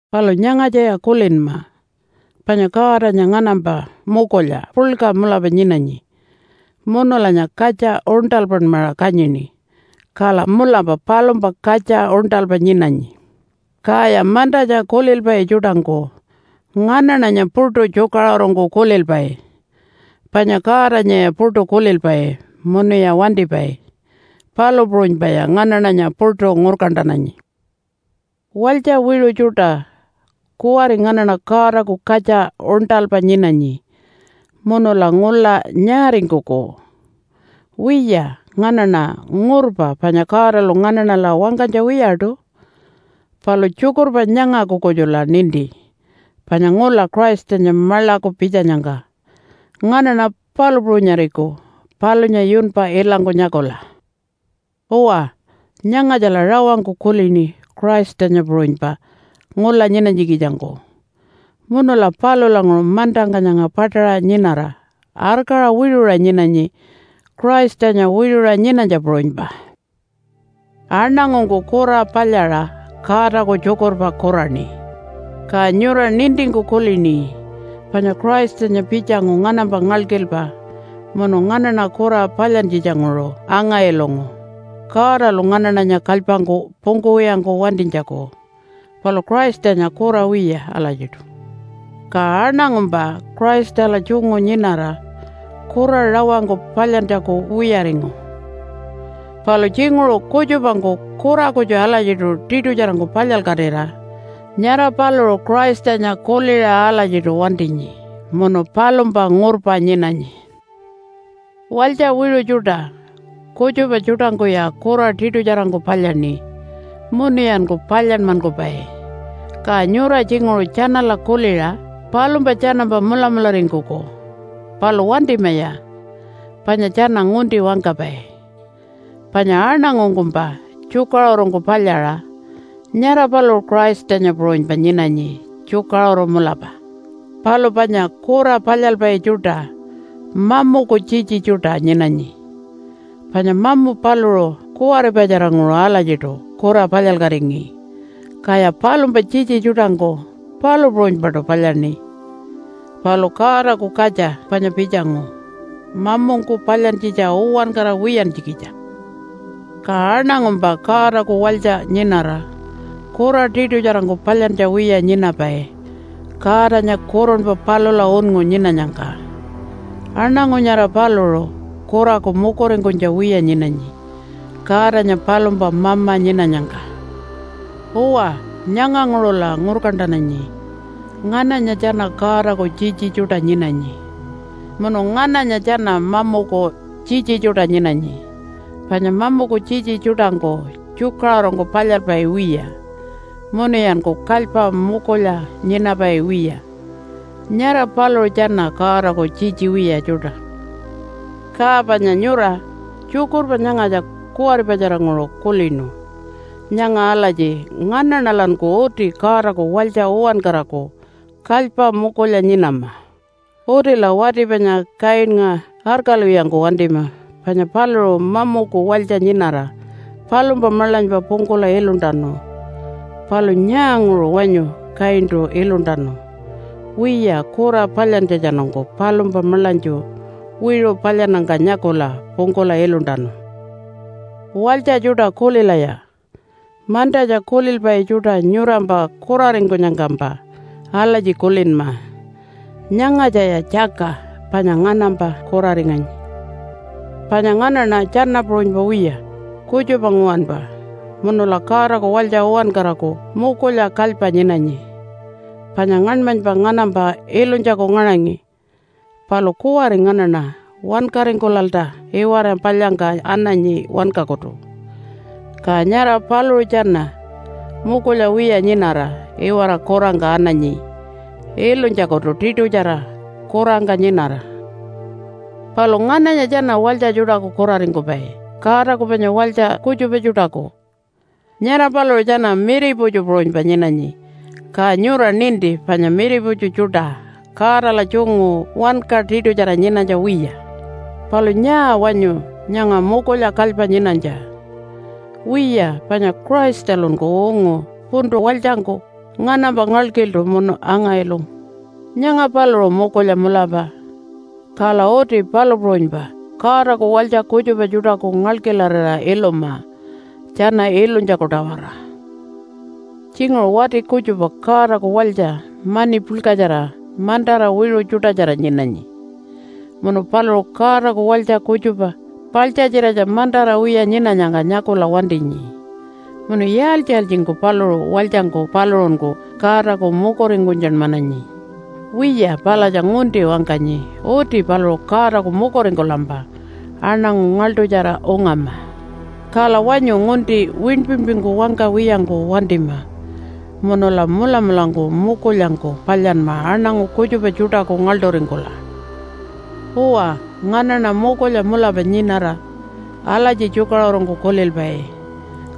Palu nyangatjaya kulinma, panya Godanya nganampa mukulya puḻka mulapa nyinanyi, munulanya katja uṉṯalpanmaṟa kanyini. Kala mulapa palumpa katja uṉṯalpa nyinanyi. Kaya mantatja kulilpai tjuṯangku nganaṉanya puṯu tjukaṟurungku kulilpai, panya Godanyaya puṯu kulilpai munuya wantipai. Palu puṟunypaya nganaṉanya puṯu ngurkantananyi. Walytja wiṟu tjuṯa, kuwari nganaṉa Godaku katja uṉṯalpa nyinanyi munula ngula nyaaringkuku? Wiya, nganaṉa ngurpa panya Godalu nganaṉala wangkanytja wiyaṯu. Palu tjukurpa nyangaku kutjula ninti, panya ngula Christanya maḻaku pitjanyangka nganaṉa palu puṟunyariku palunya yunpa ilangku nyakula. Uwa, nyangatjala rawangku kulini Christanya puṟunypa ngula nyinanytjikitjangku, munula palulanguṟu mantangka nyanga paṯaṟa nyinara arkaṟa wiṟuṟa nyinanyi Christanya wiṟuṟa nyinanytja puṟunypa. Aṉangungku kura palyaṟa Godaku tjukurpa kuraṉi. Ka nyura nintingku kulini panya Christanya pitjangu nganampa ngalkilpa munu nganaṉa kura palyantjitjanguṟu anga-ilungu Godalu nganaṉanya kalypangku pungkuwiyangku wantinytjaku. Palu Christanya kura wiya alatjiṯu. Ka aṉangumpa Christala tjungu nyinara kura rawangku palyantjaku wiyaringu. Palu tjinguṟu kutjupangku kura kutju alatjiṯu tiṯutjarangku palyalkatira nyara paluṟu Christanya kuliṟa alatjiṯu wantinyi munu palumpa ngurpa nyinanyi. Walytja wiṟu tjuṯa, kutjupa tjuṯangkuya kura tiṯutjarangku palyaṉi munuyanku palyanmankupai. Ka nyura tjinguṟu tjanala kuliṟa palumpa tjanampa mulamularingkuku, palu wantimaya panya tjana ngunti wangkapai. Panya aṉangungkumpa tjukaṟurungku palyaṟa nyara paluṟu Christanya puṟunypa nyinanyi tjukaṟuru mulapa. Palu panya kura palyalpai tjuṯa mamuku tjitji tjuṯa nyinanyi, panya mamu paluṟu kuwaripatjaranguṟu alatjiṯu kura palyalkatingi, kaya palumpa tjitji tjuṯangku palu puṟunypaṯu palyaṉi. Palu Godaku Katja panya pitjangu mamungku palyantjitja uwankara wiyantjikitja. Ka aṉangumpa Godaku walytja nyinara kura tiṯutjarangku palyantja wiya nyinapai Godanya kurunpa palula unngu nyinanyangka. Aṉangu nyara paluṟu kuraku mukuringkunytja wiya nyinanyi Godanya palumpa Mama nyinanyangka. Uwa, nyanganguṟula ngurkantananyi ngananya tjana Godaku tjitji tjuṯa nyinanyi munu ngananya tjana mamuku tjitji tjuṯa nyinanyi. Panya mamuku tjitji tjuṯangku tjukaṟurungku palyalpai wiya, munuyanku kalypa mukulya nyinapai wiya. Nyara paluṟu tjana Godaku tjitji wiya tjuṯa. Ka panya nyura tjukurpa nyangatja kuwaripatjaranguṟu kulinu nyanga alatji nganaṉalanku uti Godaku walytja uwankaraku kalypa mukulya nyinama. Utila wati panya Kainnga arkalwiyangku wantima panya paluṟu mamuku walytja nyinara palumpa maḻanypa pungkula iluntanu. Palu nyaanguṟu wanyu Kaintu iluntanu? Wiya, kura palyantjatjanungku palumpa maḻanytju wiṟu palyannyangka nyakula pungkula iluntanu. Walytja tjuṯa kulilaya, mantatja kulilpai tjuṯa nyurampa kuraringkunyangkampa alatji kulinma, “Nyangatjaya tjaka panya nganampa kuraringanyi.” Panya nganaṉa tjana puṟunypa wiya, kutjupa nguwanpa munula Godaku walytja uwankaraku mukulya kalypa nyinanyi. Panya ngaṉmanypa nganampa ilunytjaku ngaṟangi, palu kuwari nganaṉa wankaringkulalta iwara palyangka ananyi wankakutu. Ka nyara paluṟu tjana mukulya wiya nyinara iwara kurangka ananyi ilunytjakutu tiṯutjara kurangka nyinara. Palu ngananya tjana walytja tjuṯaku kuraringkupai Godaku panya walytja kutjupa tjuṯaku? Nyara paluṟu tjana miriputju puṟunypa nyinanyi. Ka nyura ninti panya miriputju tjuṯa Godala tjungu wanka tiṯutjara nyinanytja wiya. Palu nyaa wanyu nyanga mukulya kalypa nyinanytja? Wiya, panya Christalunku ungu puntu walytjangku nganampa ngalkiltu munu anga-ilungu. Nyanga paluṟu mukulya mulapa. Kala uti palu puṟunypa Godaku walytja kutjupa tjuṯaku ngalkilarira iluma tjana ilunytjaku-tawara. Tjinguṟu wati kutjupa Godaku walytja mani puḻkatjara mantara wiṟu tjuṯatjara nyinanyi, munu paluṟu Godaku walytja kutjupa paḻtjatjiratja mantara wiya nyinanyangka nyakula wantinyi. Munu yaaltji-yaaltjingku paluṟu walytjangku paluṟunku Godaku mukuringkunytjanmananyi? Wiya palatja ngunti wangkanyi. Uti paluṟu Godaku mukuringkulampa aṉangu ngaḻṯutjara ungama. Kala wanyu ngunti winpinpingku wangkawiyangku wantima munula mulamulangku mukulyangku palyanma aṉangu kutjupa tjuṯaku ngaḻṯuringkula. Uwa, nganaṉa mukulya mulapa nyinara alatji tjukaṟurungku kulilpai,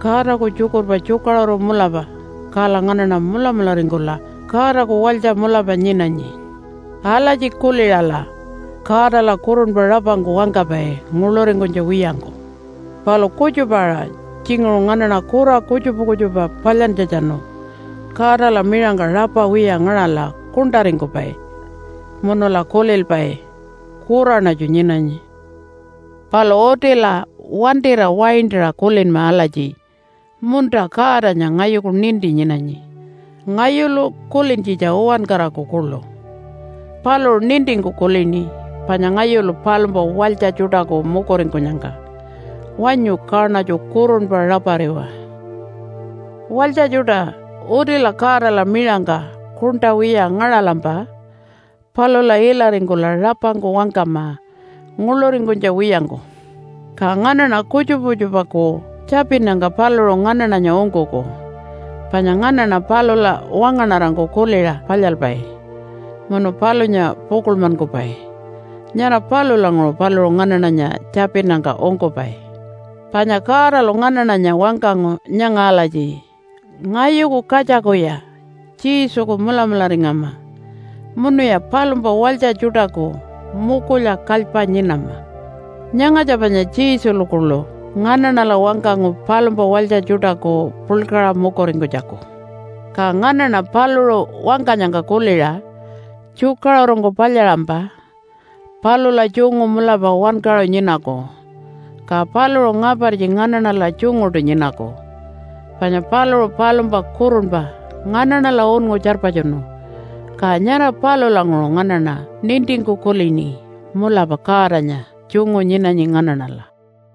“Godaku tjukurpa tjukaṟuru mulapa, kala nganaṉa mulamularingkula Godaku walytja mulapa nyinanyi.” Alatji kuliṟala Godala kurunpa rapangku wangkapai nguḻuringkunytja wiyangku. Palu kutjupa-aṟa tjinguṟu nganaṉa kura kutjupa kutjupa palyantjatjanu Godala miṟangka rapa wiya ngaṟala kuṉṯaringkupai munula kulilpai, “Kuraṉatju nyinanyi.” Palu utila wantira waintaṟa kulinma alatji, “Munta, Godanya ngayuku ninti nyinanyi, ngayulu kulintjitja uwankaraku kuḻu. Paluṟu nintingku kulini panya ngayulu palumpa walytja tjuṯaku mukuringkunyangka. Wanyu kaṉatju kurunpa rapariwa.” Walytja tjuṯa, utila Godala miṟangka kuṉṯa wiya ngaṟalampa palula ilaringkula rapangku wangkama nguḻuringkunytja wiyangku. Ka nganaṉa kutjupa kutjupaku tjapinnyangka paluṟu nganaṉanya ungkuku. Panya nganaṉa palula wangaṉarangku kuliṟa palyalpai munu palunya pukuḻmankupai. Nyara palulanguṟu paluṟu nganaṉanya tjapinnyangka ungkupai. Panya Godalu nganaṉanya wangkangu nyanga alatji, “Ngayuku katjakuya Jesuku mulamularingama, munuya palumpa walytja tjuṯaku mukulya kalypa nyinama.” Nyangatja panya Jesulu kuḻu nganaṉala wangkangu palumpa walytja tjuṯaku puḻkaṟa mukuringkunytjaku. Ka nganaṉa paluṟu wangkanyangka kuliṟa tjukaṟurungku palyaṟampa palula tjungu mulapa wankaṟu nyinaku. Ka paluṟu ngapartji nganaṉala tjunguṯu nyinaku. Panya paluṟu palumpa kurunpa nganaṉala unngu tjarpatjunu, ka nyara palulanguṟu nganaṉa nintingku kulini, “Mulapa Godanya tjungu nyinanyi nganaṉala.”